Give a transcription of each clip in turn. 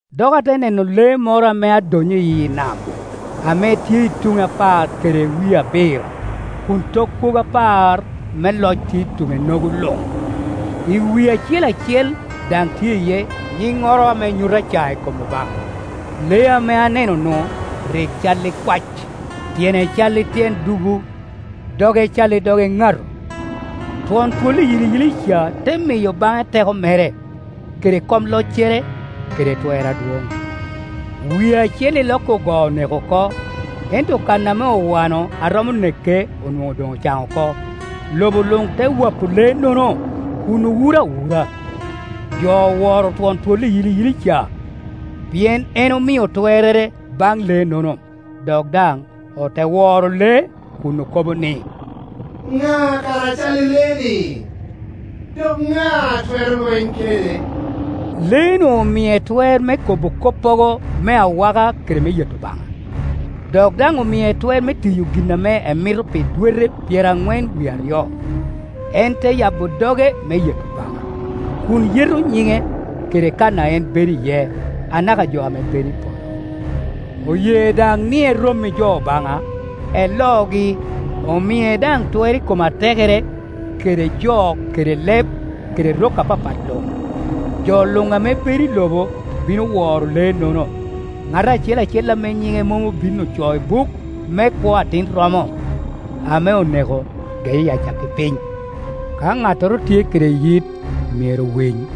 Dok ate neno lee moro ame adonnyo iyi nam, ame tye i tuŋe apar kede wie abiro, kun tok kwogo apar me loc tye i tuŋe-nogo luŋ; i wie acel acel daŋ tye iye nyinnoro ame nyuto acae i kom Obaŋa. Lee ame anenonu rik cal i kwac, tyene cal i tyen dubu, doge cal i dog eŋato. Twon twol iyiliyili ca te miyo baŋe teko mere, kede kom loccere, kede twer adwoŋ. Wie acel iloki ogoo oneko oko, ento kan ame owano a romo neke onwoŋo doŋ ocaŋ oko. Lobo luŋ te wapo lee-nono kun owuro awura. Jo oworo twon twol iyiliyili ca, pien en omio twerrere baŋ lee-nono, dok daŋ ote woro lee kun okobo ni, “Ŋa kara a cal i Iee-ni, dok ŋa a twero lweny kede?” Lee-nu omie twer me kobo koppogo me awaka kede me yeto Obaŋa, dok daŋ omie twer me tiyo gin ame emito pi dwete pyeraŋwen wie aryo. En te yabo doge me yeto Obaŋa, kun yeto nyiŋe, kede kan a en bedo iye, anaka jo ame bedo i polo. Oye daŋ ni erom i jo Obaŋa, elogi, omie daŋ twer i kom atekere kede jo kede leb kede rok apapat luŋ, lo luŋ ame bedo i lobo bino woro lee-nono, ŋat acel acel ame nyiŋe mom obin ocoo i buk me kwo Atin romo ame oneko, geye i acakki piny. Ka ŋattoro tye kede yit myero owiny.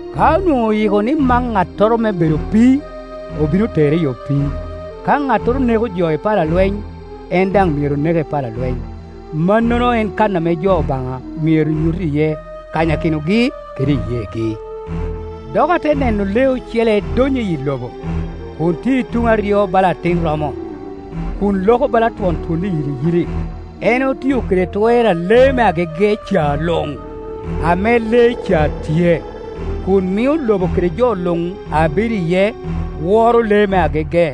Ka onwoŋo oyiko ni mak ŋattoro me bedo opii, obino tere i opii; ka ŋattoro neko jo i pala lweny, en daŋ myero neke i pala lweny, Mannono en kan ame jo Obaŋa myero nyut iye kanyakinogi kede iyeegi. Dok ate neno lee ocele donnyo iyi lobo, kun tye i tuŋe aryo bala atin romo, kun loko bala twon twol iyiliyili. En otio kede twer a lee me agege ca luŋ ame lee ca tye; kun mio lobo kede jo luŋ a bedo iye woro lee me agege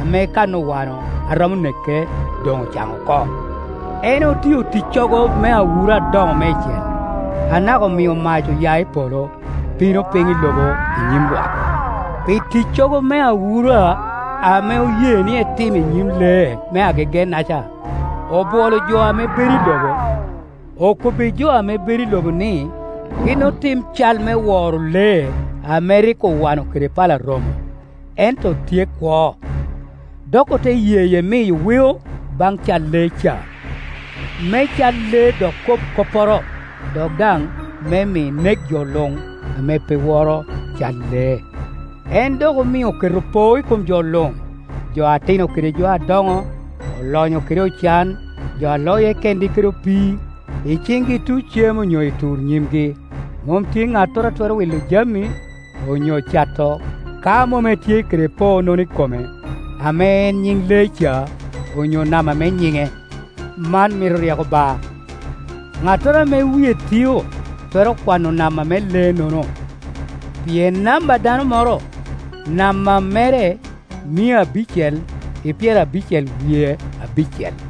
ame kan owano a romo neke doŋ ocaŋ oko. En otio ticcogo me awura adoŋo meicel, anaka omio mac oya i polo, bino piny i lobo i nyim lwak. Pi ticcogo me awura ame oye ni etim i nyim lee me agege-naca, obwolo jo ame bedo i lobo, okobbijo ame bedo i lobo ni gin otim cal me woro lee ame rik owano kede pala romo, ento tye kwo. Dok ote yeye miyo weo baŋ cal lee ca, me cal lee dok kob kopporo, dok daŋ me mi nek jo luŋ ame pe woro cal lee. En dok omio oketo poo i kom jo luŋ, jo atino kede jo adoŋo, olonyo kede ocan, jo a loye kengi kede opii, i ciŋgi luŋ cem onyo i tur nyimgi. Mom tye ŋattoro a twero wi lo jami, onyo cato, ka mom etye kede poo-nono i kome, ame en nyiŋ lee ca, onyo namba me nyiŋe. Man mito ryeko ba, ŋattoro ame wie tio twero kwano namba me lee-nono, pien namba a dano moro; namba mere mia abicel i pyerabicel wie abicel.